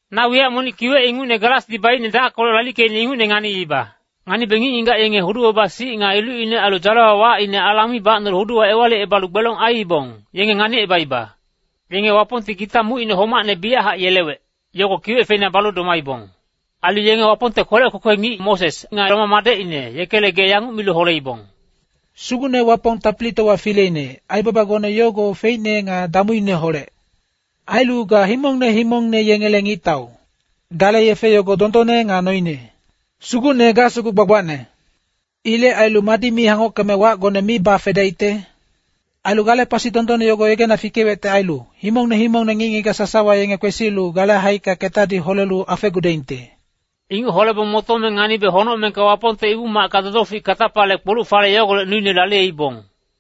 Na wiyac monic kiwec ingucne galasdi baicne dackolec lalickeicne ingucne nganiiba. Nganibe ngic-ngigac yenge hudu-baba-sic nga ilucine ailu dzalewa wacine alang mi bacnolu huduwa ewalicebalu gbelong aiibong, yenge nganicebaiba. Yenge Wapongti gita mucine homacne biyachac yelewec, yogo kiwec feina balu domaibong. Ailu yenge Wapongte kwelec kwekwe ngic Moses nga Lama madecine, yekele gee yanguc milu holeibong, “Sugucne Wapong Tapilitowa Fileine, aibabagone yogo feicne nga damuineholec. Ailu ga himongne himongne yengele ngictau. Gale yefe yogo dondonne nga noine. Sugucne ga sugu gbagbacne. Ilec ailu madi mi hangockeme wacgone mi bafedaicte? Ailu gale pasi dondonne yogo yegena fikewecte ailu, himongne himongne ngic-ngigac sasawa yenge kwesilu gale haicka ketadi holelu afegudaingte.” Inguc holebong motome nganibe honocmengka Wapongte Ibu-macka dodofic katapale kpoluc-fale yogolec nuine laliyeibong.